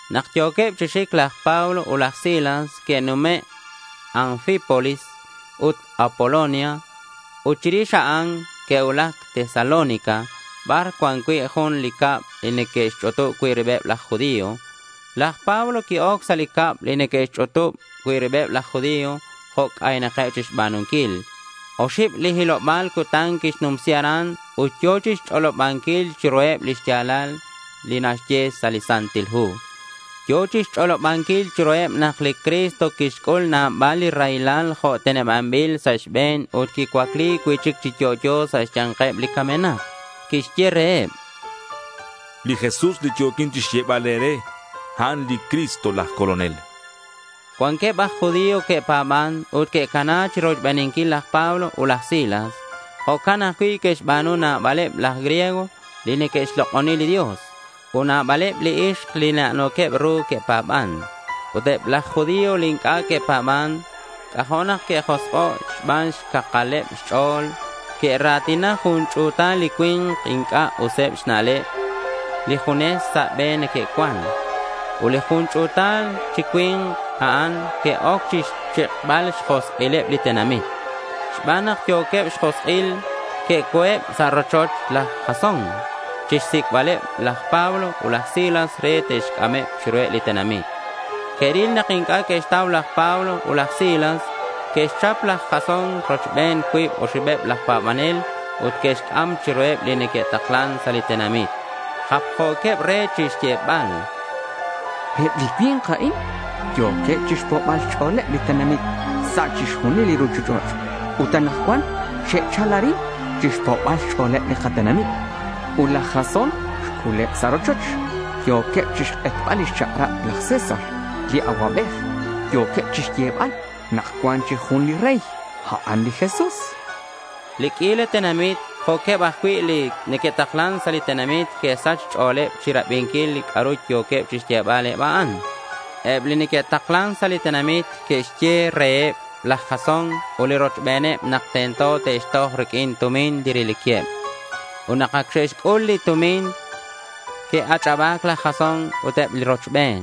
Nak yo̱queb chi xic laj Pablo ut laj Silas que'nume' Anfípolis ut Apolonia. Ut chirix a'an, que'cuulac Tesalónica bar cuan cui' jun li cab li neque'xch'utub cui' ribeb laj judío. Laj Pablo qui-oc sa' li cab li neque'xch'utub cui' ribeb laj judío jo' c'aynak chixba̱nunquil. Oxib li hiloba̱l cutan quixnumsi aran ut yo̱ chixch'olobanquil chiruheb li xya̱lal li naxye sa' li Santil Hu. Yo̱ chixch'olobanquil chiruheb nak li Cristo quixc'ul nabal li raylal jo' tenebanbil sa' xbe̱n ut quicuacli cui'chic chi yo'yo sa' xya̱nkeb li camenak. Quixye reheb: —Li Jesús li yo̱quin chixyebal e̱re, a'an li Cristo laj Colonel, chan. Cuanqueb aj judío que'pa̱ban ut que'cana chirochbeninquil laj Pablo ut laj Silas. Jo'can ajcui' que'xba̱nu nabaleb laj griego li neque'xlok'oni li Dios. Ut nabaleb li ixk li na'no̱queb ru que'pa̱ban. Ut eb laj judío li inc'a' que'pa̱ban, c'ajo' nak que'josk'o' xban xcakaleb xch'o̱l. Que'ra̱tina jun ch'u̱tal li cui̱nk inc'a' useb xna'leb li junes sa' be neque'cuan. Ut li jun ch'u̱tal chi cui̱nk a'an que'oc chixchik'bal xjosk'ileb li tenamit. Xban nak yo̱queb xjosk'il, que'oc sa' rochoch laj Jasón chixsic'baleb laj Pablo ut laj Silas re te'xc'ameb chiruheb li tenamit. Que'ril nak inc'a' que'xtau laj Pablo ut laj Silas. Que'xchap laj Jasón rochben cuib oxibeb laj pa̱banel ut que'xc'am chiruheb li neque'taklan sa' li tenamit. Japjo̱queb re chixyebal: —Eb li cui̱nk a'in, yo̱queb chixpo'bal xch'o̱leb li tenamit sa' chixjunil li ruchich'och' ut anakcuan xe'chal arin chixpo'bal xch'o̱leb li katenamit. Ut laj Jasón xc'uleb sa' rochoch. Yo̱queb chixk'etbal lix chak'rab laj César li Acuabej. Yo̱queb chixyebal nak cuan jun chic li rey, a'an li Jesús, chanqueb. Li q'uila tenamit jo'queb ajcui' li neque'taklan sa' li tenamit que'sach xch'o̱leb chirabinquil li c'a'ru yo̱queb chixyebal eb a'an. Eb li neque'taklan sa' li tenamit que'xye reheb laj Jasón ut li rochben nak tento te'xtoj riq'uin tumin li reliqueb. Ut nak ac xe'xc'ul li tumin, que'ach'aba̱c laj Jasón ut eb li rochben.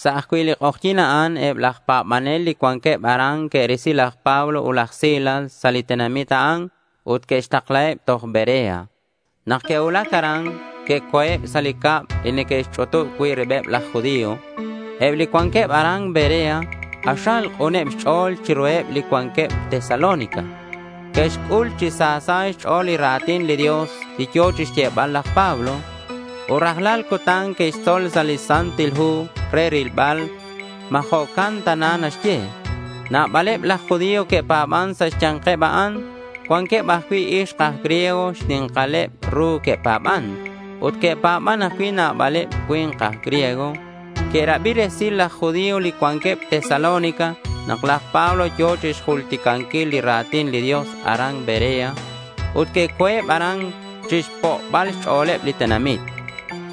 Sa' ajcui' li k'ojyi̱n a'an eb laj pa̱banel li cuanqueb aran que'risi laj Pablo ut laj Silas sa' li tenamit a'an ut que'xtaklaheb toj Berea. Nak que'cuulac aran, que'co̱eb sa' li cab li neque'xch'utub cui' ribeb laj judío. Eb li cuanqueb aran Berea k'axal k'uneb xch'o̱l chiruheb li cuanqueb Tesalónica. Que'xc'ul chi sa sa' xch'o̱leb li ra̱tin li Dios li yo̱ chixyebal laj Pablo. Ut rajlal cutan que'xtzol sa' li Santil Hu re rilbal ma jo'can tana naxye. Nabaleb laj judío que'pa̱ban sa' xya̱nkeb a'an. Cuanqueb ajcui' ixk aj griego xni̱nkaleb ru que'pa̱ban. Ut que'pa̱ban ajcui' nabaleb li cui̱nk aj griego. Que'rabi resil laj judío li cuanqueb Tesalónica nak laj Pablo yo̱ chixjulticanquil li ra̱tin li Dios aran Berea. Ut que'co̱eb aran chixpo'bal xch'o̱leb li tenamit.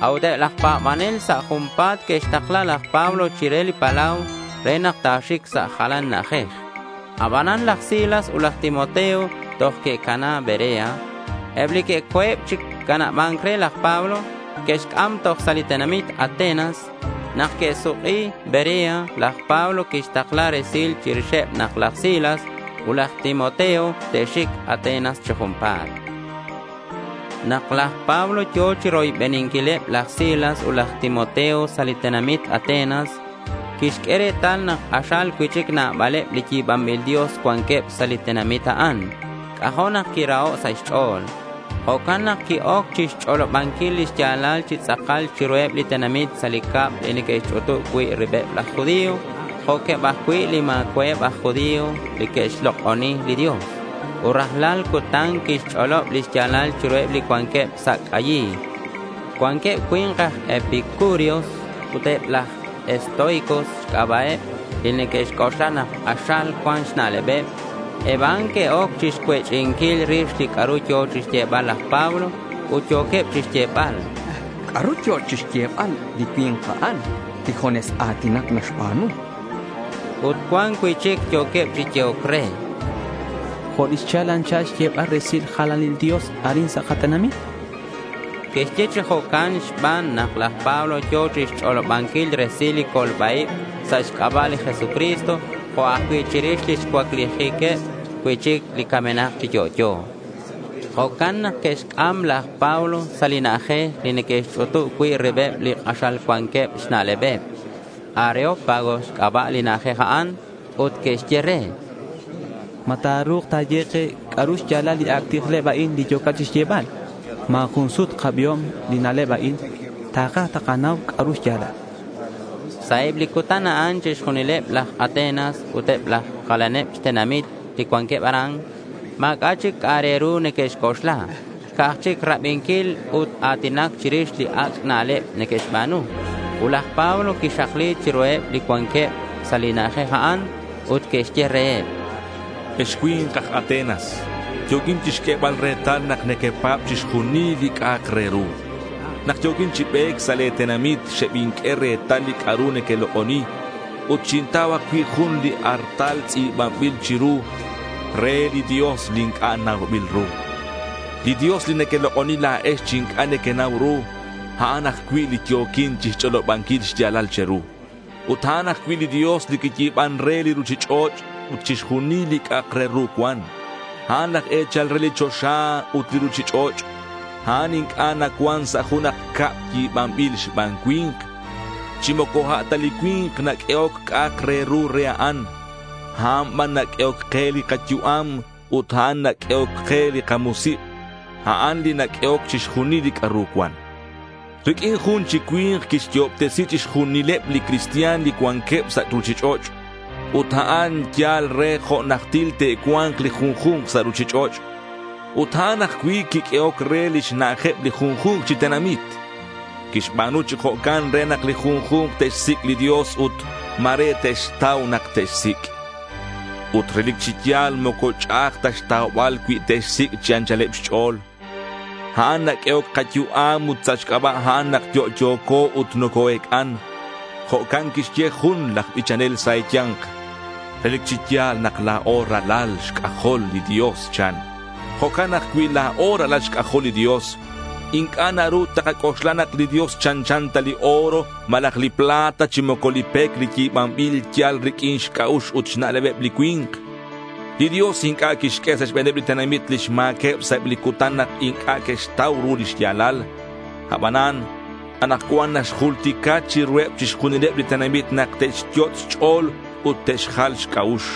A'ut eb laj pa̱banel sa' junpa̱t que'xtakla laj Pablo chire li palau re nak ta̱xic sa' jalan na'ajej. Aban laj Silas ut laj Timoteo toj que'cana Berea. Eb li que'co̱eb chi canaba̱nc re laj Pablo, que'xc'am toj sa' li tenamit Atenas. Nak que'suk'i Berea, laj Pablo quixtakla resil chirixeb nak laj Silas ut laj Timoteo te'xic Atenas chi junpa̱t. Nak laj Pablo yo̱ chiroybeninquileb laj Silas ut laj Timoteo sa' li tenamit Atenas, quixq'ue retal nak k'axal cui'chic nabaleb li yi̱banbil Dios cuanqueb sa' li tenamit a'an. C'ajo' nak quiraho' sa' xch'o̱l. Jo'can nak qui-oc chixch'olobanquil lix ya̱lal chi tz'akal chiruheb li tenamit sa' li cab li neque'xch'utub cui' ribeb laj judío jo'queb ajcui' li ma̱cua'eb aj judío li que'xlok'oni li Dios. Ut rajlal cutan quixch'olob li xya̱lal chiruheb li cuanqueb sa' c'ayil. Cuanqueb cui̱nk aj epicúreos ut eb aj estoicos xc'aba'eb li neque'xc'oxla nak k'axal cuan xna'lebeb. Eb a'an que'oc chixcuech'inquil rix li c'a'ru yo̱ chixyebal laj Pablo. Ut yo̱queb chixyebal: —¿C'a'ru yo̱ chixyebal li cui̱nk a'an li junes a̱tinac naxba̱nu? Ut cuan cui'chic yo̱queb chi yehoc re: —Jo' li xchal anchal xyebal resil jalanil dios arin sa' katenamit, chanqueb. Que'xye chi jo'can xban nak laj Pablo yo̱ chixch'olobanquil resil li colba-ib sa' xc'aba' li Jesucristo jo' ajcui' chirix lix cuaclijiqueb cui'chic li camenak chi yo'yo. Jo'can nak que'xc'am laj Pablo sa' li na'ajej li neque'xch'utub cui' ribeb li k'axal cuanqueb xna'leb. Areópago xc'aba' li na'ajej a'an. Ut que'xye re: —¿Ma ta̱ru̱k ta̱ye ke c'a'ru xya̱lal li ac' tijleb a'in li yo̱cat chixyebal? Ma̱ jun sut kabiom li na'leb a'in. Takaj takanau c'a'ru xya̱lal, chanqueb re. Sa' eb li cutan a'an chixjunileb laj Atenas ut eb li jalaneb xtenamit li cuanqueb aran, ma̱c'a' chic c'a'ak re ru neque'xc'oxla. Ca'aj chic rabinquil ut a̱tinac chirix li ac' na'leb neque'xba̱nu. Ut laj Pablo quixakli chiruheb li cuanqueb sa' li na'ajej a'an, ut quixye reheb: —Ex cui̱nk aj Atenas, yo̱quin chixq'uebal retal nak nequepa̱b chixjunil li c'a'ak re ru. Nak yo̱quin chi be̱c sa' le̱ tenamit xebinq'ue retal li c'a'ru nequelok'oni ut xintau ajcui' jun li artal tz'i̱banbil chiru “Re li Dios li Inc'a' Naubil Ru”. Li Dios li nequelok'oni la̱ex chi inc'a' nequenau ru, a'an ajcui' li yo̱quin chixch'olobanquil xya̱lal che̱ru. Ut a'an ajcui' li Dios, li quiyi̱ban re li ruchich'och' ut chixjunil li c'a'ak re ru cuan. A'an laj e̱chal re li choxa ut li ruchich'och'. A'an inc'a' nacuan sa' junak cab yi̱banbil xban cui̱nk. Chi moco a' ta li cui̱nk naq'uehoc c'a'ak re ru re a'an. A'an ban naq'uehoc ke li kayu'am ut a'an naq'uehoc li kamusik'. A'an li naq'uehoc chixjunil li c'a'ru cuan. Riq'uin jun chi cui̱nk quixyo'obtesi chixjunileb li cristian li cuanqueb sa' ruchich'och'. Ut a'an yal re jo' najtil te'cua̱nk li junju̱nk sa' ruchich'och'. Ut a'an ajcui' quiq'uehoc re lix na'ajeb li junju̱nk chi tenamit. Quixba̱nu chi jo'can re nak li junju̱nk te'xsic' li Dios ut ma̱re te'xtau nak te'xsic'. Ut relic chi ya̱l moco ch'a'aj ta xtaubal cui te'xsic' chi anchaleb xch'o̱l. A'an naq'uehoc kayu'am ut sa' xc'aba' a'an nak yo'yo̱co ut noco-ec'an. Jo' quixye jun laj bichanel sa' e̱ya̱nk: —Relic chi ya̱l nak la̱o ralal xc'ajol li Dios, chan. Jo'can nak cui la̱o ralal xc'ajol li Dios, inc'a' naru takac'oxla nak li Dios chanchan ta li oro, malaj li plata chi moco li pec li yi̱banbil yal riq'uin xc'a'ux ut xna'lebeb li cui̱nk. Li Dios inc'a' quixq'ue sa' xbe̱neb li tenamit lix ma̱queb sa' eb li cutan nak inc'a' que'xtau ru li xya̱lal. Abanan anakcuan naxjultica chiruheb chixjunileb li tenamit nak te'xyot' xch'o̱l te'xjal xc'a'ux.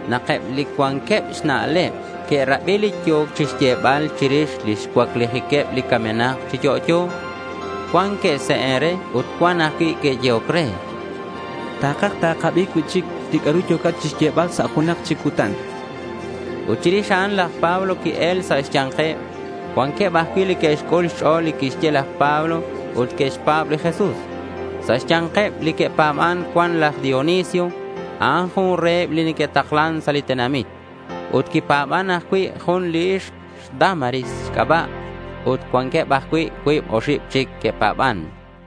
Nak eb li cuanqueb xna'leb que'rabi li yo̱ chixyebal chirix lix cuaclijiqueb li camenak chi yo'yo, cuan que'se'en re ut cuan ajcui' que'yehoc re: —Takaj takabi cui'chic li c'a'ru yo̱cat chixyebal sa' junak chic cutan, chanqueb. Ut chirix a'an, laj Pablo qui-el sa' xya̱nkeb. Cuanqueb ajcui' li que'xc'ul xch'o̱l li quixye laj Pablo ut que'xpa̱b li Jesús. Sa' xya̱nkeb li que'pa̱ban cuan laj Dionisio. A'an jun reheb li que'taklan sa' li tenamit. Ut quipa̱ban ajcui' jun li ixk xDámaris xc'aba'. Ut cuanqueb ajcui' cuib oxib chic que'pa̱ban.